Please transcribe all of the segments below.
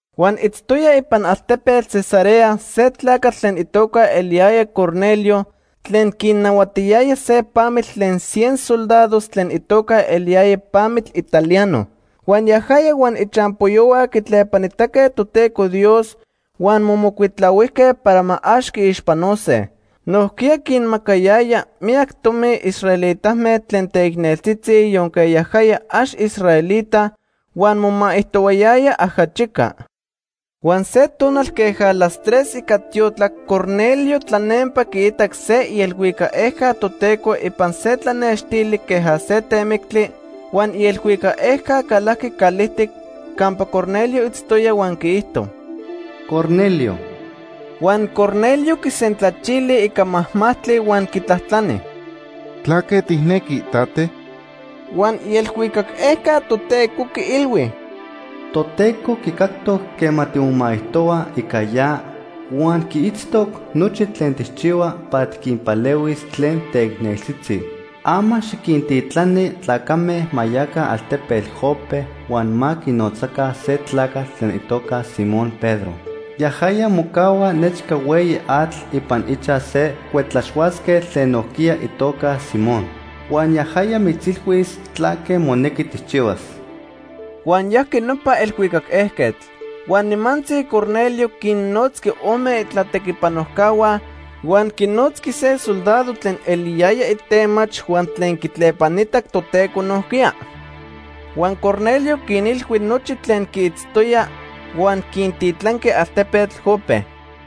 Huan itztoya ipan altepetl Cesarea se tlacatl tlen itoca eliyaya Cornelio tlen quinahuatiyaya se pamitl tlen cien soldados tlen itoca eliyaya Pamitl Italiano. Huan yajaya huan ichampoyohua quitlepanitaque Toteco Dios huan momocuitlahuijque para ma ax quiixpanose. Nojquiya quinmacayaya miyac tomi israelitame tlen teicneltzitzi yonque yajaya ax israelita, huan momaijtohuayaya ajachica. Huan se tonal queja las tres ica tiotlac Cornelio tlanempa quiitac se ielhuicac ejca Toteco ipan se tlanextili queja se temictli huan ielhuicac ejca calajqui calijtic campa Cornelio itztoya huan quiijto: “¡Cornelio!” Huan Cornelio quisentlachili ica majmajtli huan quitlajtlani: “¿Tlaque tijnequi, tate?” Huan ielhuicac ejca Toteco quiilhui: “Toteco quicactoc quema timomaijtohua ica ya, huan quiitztoc nochi tlen tijchihua para tiquinpalehuis tlen teicneltzitzi. Ama xiquintitlani tlacame ma yaca altepetl Jope, huan ma quinotzaca se tlacatl tlen itoca Simón Pedro. Yajaya mocahua nechca hueyi atl ipan ichaj se cuetlaxhuatzquetl tlen nojquiya itoca Simón. Huan yajaya mitzilhuis tlaque monequi tijchihuas.” Huan yajqui nopa elhuicac ejquetl. Huan nimantzi Cornelio quinnotzqui ome itlatequipanojcahua, huan quinotzqui se soldado tlen eliyaya itemach huan tlen quitlepanitac Toteco nojquiya. Huan Cornelio quinilhui nochi tlen quiitztoya huan quintitlanqui altepetl Jope.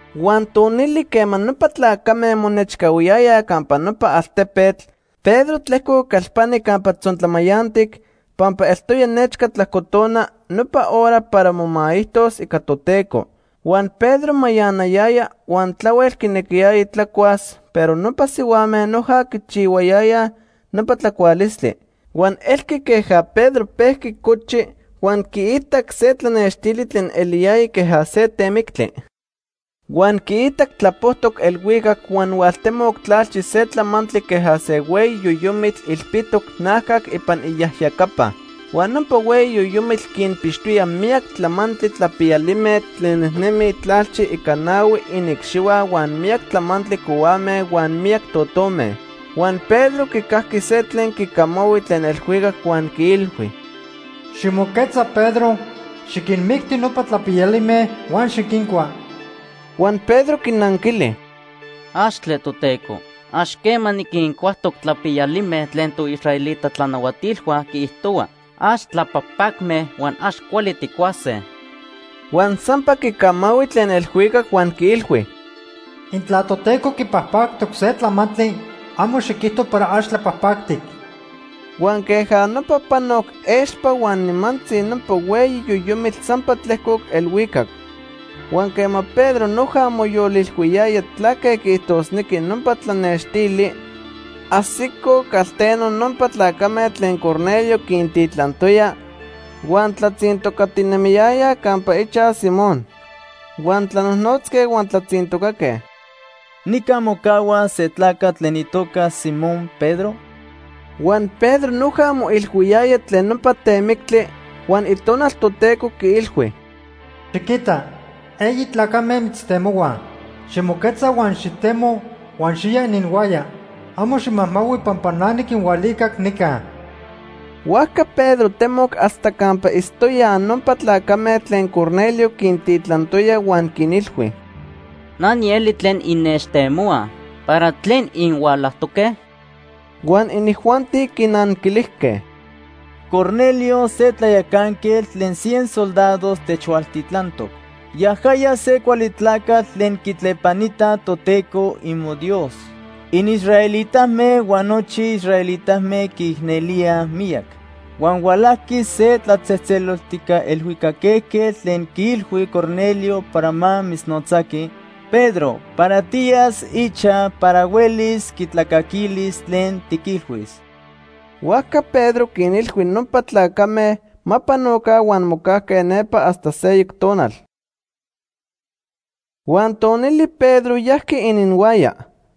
Huan tonili quema nopa tlacame monechcahuiyayaj campa nopa altepetl, Pedro tlejcoc calpani campa tzontlamayantic pampa eltoya nechca tlajcotona, nopa hora para momaijtos ica Toteco. Huan Pedro mayanayaya huan tlahuel quinequiyaya tlacuas, pero nopa sihuame noja quichihuayayaj nopa tlacualistli. Huan elqui queja Pedro pejqui cochi huan quiitac se tlanextili tlen eliyaya queja se temictli. Huan quiitac tlapojtoc elhuicac huan hualtemoc tlalchi se tlamantli queja se hueyi yoyomitl ilpitoc najcac ipan iyajyacapa. Huan nopa hueyi yoyomitl quinpixtoya miyac tlamantli tlapiyalime tlen nejnemij tlalchi ica nahui iniicxihua huan miyac tlamantli cohuame huan miyac totome. Huan Pedro quicajqui se tlen quicamahui tlen elhuicac huan quiilhui: “Ximoquetza Pedro, xiquinmicti nopa tlapiyalime huan xiquincua.” Huan Pedro quinanquili: “¡Axtle, Toteco! Ax quema niquincuajtoc tlapiyalime tlen toisraelita tlanahuatilhua quiijtohua ax tlapajpacme huan ax cuali tijcuase.” Huan sampa quicamahui tlen elhuicac huan quiilhui: “Intla Toteco quipajpactoc se tlamantli, amo xiquijto para ax tlapajpactic.” Huan queja nopa panoc expa huan nimantzi nopa hueyi yoyomitl sampa tlejcoc elhuicac. Huan quema Pedro noja moyolilhuiyaya tlaque quiijtosnequi nopa tlanextili, ajsicoj calteno nopa tlacame tlen Cornelio quintitlantoya huan tlatzintocatinemiyayaj campa ichaj Simón. Huan tlanojnotzque huan tlatzintocaque: “¿Nica mocahua se tlacatl tlen itoca Simón Pedro?” Huan Pedro noja moilhuiyaya tlen nopa temictli huan Itonal Toteco quiilhui: “Xiquita, eyi tlacame mitztemohuaj. Ximoquetza huan xitemo huan xiya ininhuaya. Amo ximajmahui pampa na niquinhualicac nica.” Huajca Pedro temoc hasta campa itztoyaj nopa tlacame tlen Cornelio quintitlantoya huan quinilhui: ―Na nieli tlen innechtemohuaj. ¿Para tlen inhualajtoque? Huan inijuanti quinanquilijque: ―Cornelio, se tlayacanquetl tlen cien soldados, techhualtitlantoc. Yajaya se cuali tlacatl tlen quitlepanita Toteco imoDios inisraelitame huan nochi israelitame quiicnelíaj miyac. Huan hualajqui se tlatzejtzeloltijca elhuicac ejquetl tlen quiilhui Cornelio para ma mitznotzaqui, Pedro, para tiyas ichaj para huelis quitlacaquilis tlen tiquilhuis. Huajca Pedro quinilhui nopa tlacame ma panoca huan mocajque nepa hasta seyoc tonal. Huan tonili Pedro yajqui ininhuaya.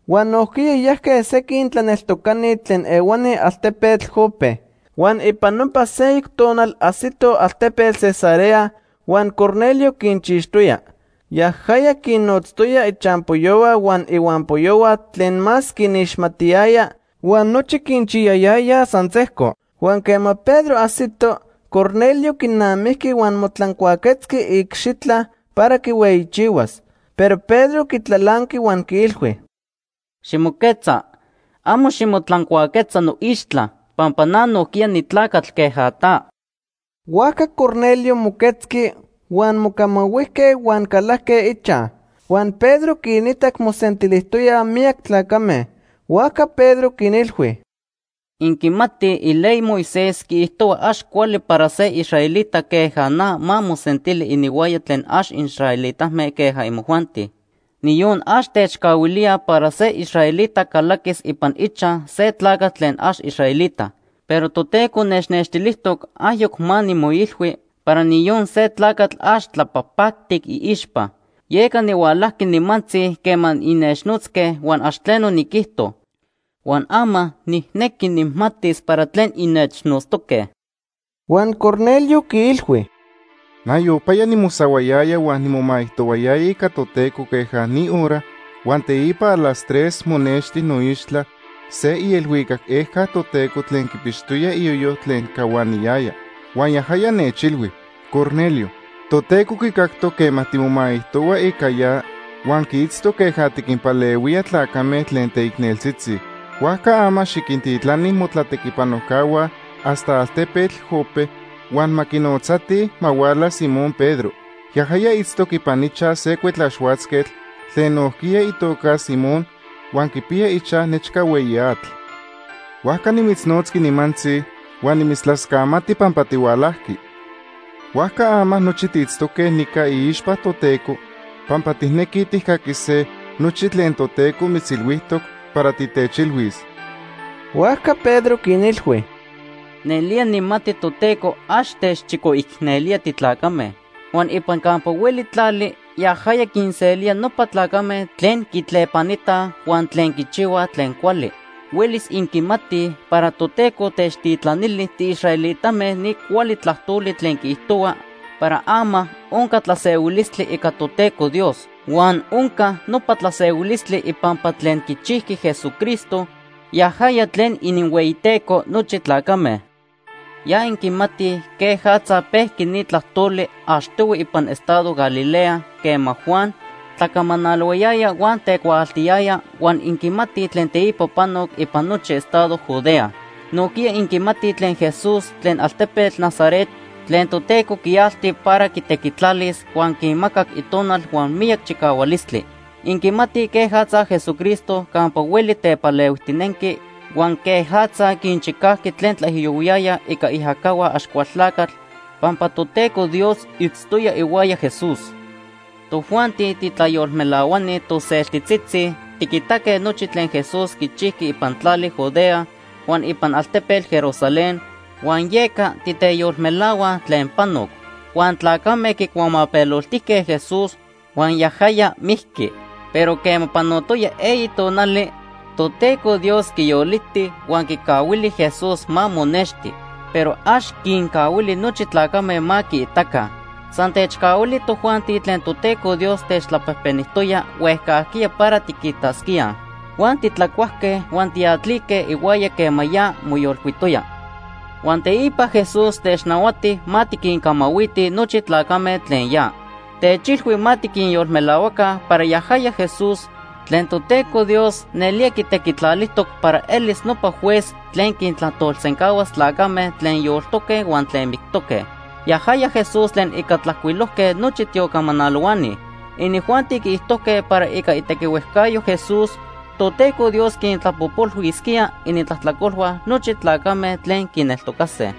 Huan nojquiya yajque sequin tlaneltocani tlen ehuani altepetl Jope. Huan ipan nopa seyoc tonal ajsitoj altepetl Cesarea huan Cornelio quinchixtoya. Yajaya quinnotztoya ichampoyohua huan ihuampoyohua tlen más quinixmatiyaya huan nochi quinchiyayayaj san sejco. Huan quema Pedro ajsito, Cornelio quinamijqui huan motlancuaquetzqui iicxitla para quihueyichihuas. Pero Pedro quitlalanqui huan quiilhui: ―Ximoquetza, amo ximotlancuaquetza noixtla, pampa na nojquiya nitlacatl queja ta. Huajca Cornelio moquetzqui, huan mocamahuijque huan calajque ichaj. Huan Pedro quinitac mosentilijtoyaj miyac tlacame. Huajca Pedro quinilhui: ―Inquimatij iley Moisés quiijtohua ax cuali para se israelita queja na ma mosentili ininhuaya tlen ax israelitame queja imojuanti. Niyon ax techcahuilía para se israelita calaquis ipan ichaj se tlacatl tlen ax israelita. Pero Toteco nechnextilijtoc ayoc ma nimoilhui para niyon se tlacatl ax tlapajpactic iixpa. Yeca nihualajqui nimantzi quema innechnotzque huan ax tleno niquijto. Huan ama nijnequi nijmatis para tlen innechnotztoque. Huan Cornelio quiilhui: ―Nayopaya nimosahuayaya huan nimomaijtoyaya ica Toteco queja ni hora, huan teipa a las tres monexti noixtla se ielhuicac ejca Toteco tlen quipixtoya iyoyo tlen cahuaniyaya. Huan yajaya nechilhui: ‘Cornelio, Toteco quicactoc quema timomaijtohua ica ya huan quiitztoc queja tiquinpalehuía tlacame tlen teicneltzitzi. Huajca ama xiquintitlani motlatequipanojcahua hasta altepetl Jope, huan ma quinotzatij ma huala Simón Pedro. Yajaya itztoc ipan ichaj se cuetlaxhuatzquetl tlen nojquiya itoca Simón huan quipiya ichaj nechca hueyi atl.’ Huajca nimitznotzqui nimantzi huan nimitztlascamati pampa tihualajqui. Huajca ama nochi tiitztoque nica iixpa Toteco pampa tijnequij tijcaquise nochi tlen Toteco mitzilhuijtoc para titechilhuis. Huajca Pedro quinilhui: ―Nelía nijmati Toteco ax techchicoicnelía titlacame. Huan ipan campa hueli tlali yajaya quinselía nopa tlacame tlen quitlepanitaj huan tlen quichihuaj tlen cuali. Huelis inquimatij para Toteco techtitlanili tiisraelitame ni cuali tlajtoli tlen quiijtohua para ama onca tlasehuilistli ica Toteco Dios. Huan onca nopa tlasehuilistli ipampa tlen quichijqui Jesucristo, yajaya tlen ininhueyiTeco nochi tlacame. Ya inquimatij quejatza pejqui ni tlajtoli achtohui ipan estado Galilea quema Juan tlacamanalohuayaya huan tecuaaltiyaya huan inquimatij tlen teipa panoc ipan nochi estado Judea. Nojquiya inquimatij tlen Jesús tlen altepetl Nazaret tlen Toteco quialti para quitequitlalis, huan quimacac Itonal huan miyac chicahualistli. Inquimatij quejatza Jesucristo campa hueli tepalehuijtinenqui huan quejatza quinchicajqui tlen tlaijiyohuiyayaj ica iajacahua Axcualtlacatl, pampa Toteco Dios itztoya ihuaya Jesús. “Tojuanti titlayolmelahuani toseltitzitzi tiquitaque nochi tlen Jesús quichijqui ipan tlali Judea huan ipan altepetl Jerusalén, huan yeca titeyolmelahuaj tlen panoc. Huan tlacame quicuamapeloltijque Jesús huan yajaya mijqui. Pero quema panotoya eyi tonali, Toteco Dios quiyoliti, huan quicahuili Jesús ma monexti. Pero ax quincahuili nochi tlacame ma quiitaca. San techcahuili tojuanti tlen Toteco Dios techtlapejpenijtoya huejcajquiya para tiquitasquía. Huan titlacuajque huan tiatlique ihuaya quema ya moyolcuitoya. Huan teipa Jesús technahuati ma tiquincamahuitij nochi tlacame tlen ya. Techilhui ma tiquinyolmelahuaca para yajaya Jesús tlen Toteco Dios nelía quitequitlalijtoc para elis nopa Juez tlen quintlajtolsencahuas tlacame tlen yoltoque huan tlen mictoque. Yajaya Jesús tlen ica tlajcuilojque nochi tiocamanalohuani. Inijuanti quiijtojque para ica itequihuejcayo Jesús, Toteco Dios quintlapojpolhuisquía inintlajtlacolhua nochi tlacame tlen quineltocase.”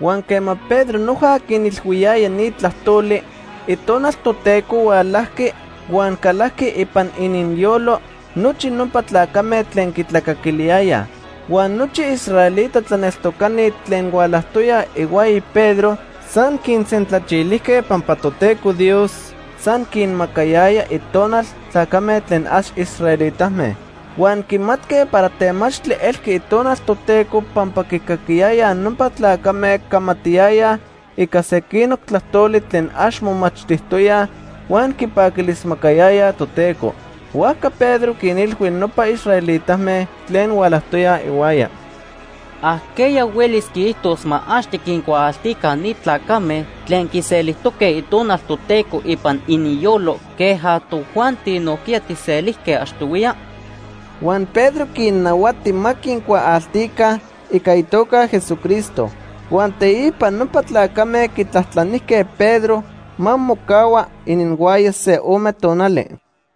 Huan quema Pedro noja quinilhuiyaya ni tlajtoli, Itonal Toteco hualajqui huan calajqui ipan ininyolo nochi nopa tlacame tlen quitlacaquiliyayaj. Huan nochi israelita tlaneltocani tlen hualajtoyaj ihuaya Pedro san quinsentlachilijque pampa Toteco Dios san quinmacayaya Itonal tlacame tlen ax israelitame. Huan quimatque para temachtli elqui Itonal Toteco pampa quicaquiyayaj nopa tlacame camatiyayaj ica sequinoc tlajtoli tlen ax momachtijtoyaj huan quipaquilismacayayaj Toteco. Huajca Pedro quinilhui nopa israelitame tlen hualajtoyaj ihuaya: ―¿Ajqueya huelis quiijtos ma ax tiquincuaaltica ni tlacame tlen quiselijtoque Itonal Toteco ipan ininyolo queja tojuanti nojquiya tijselijque achtohuiya? Huan Pedro quinnahuati ma quincuaaltica ica itoca Jesucristo. Huan teipa nopa tlacame quitlajtlanijque Pedro ma mocahua ininhuaya se ome tonali.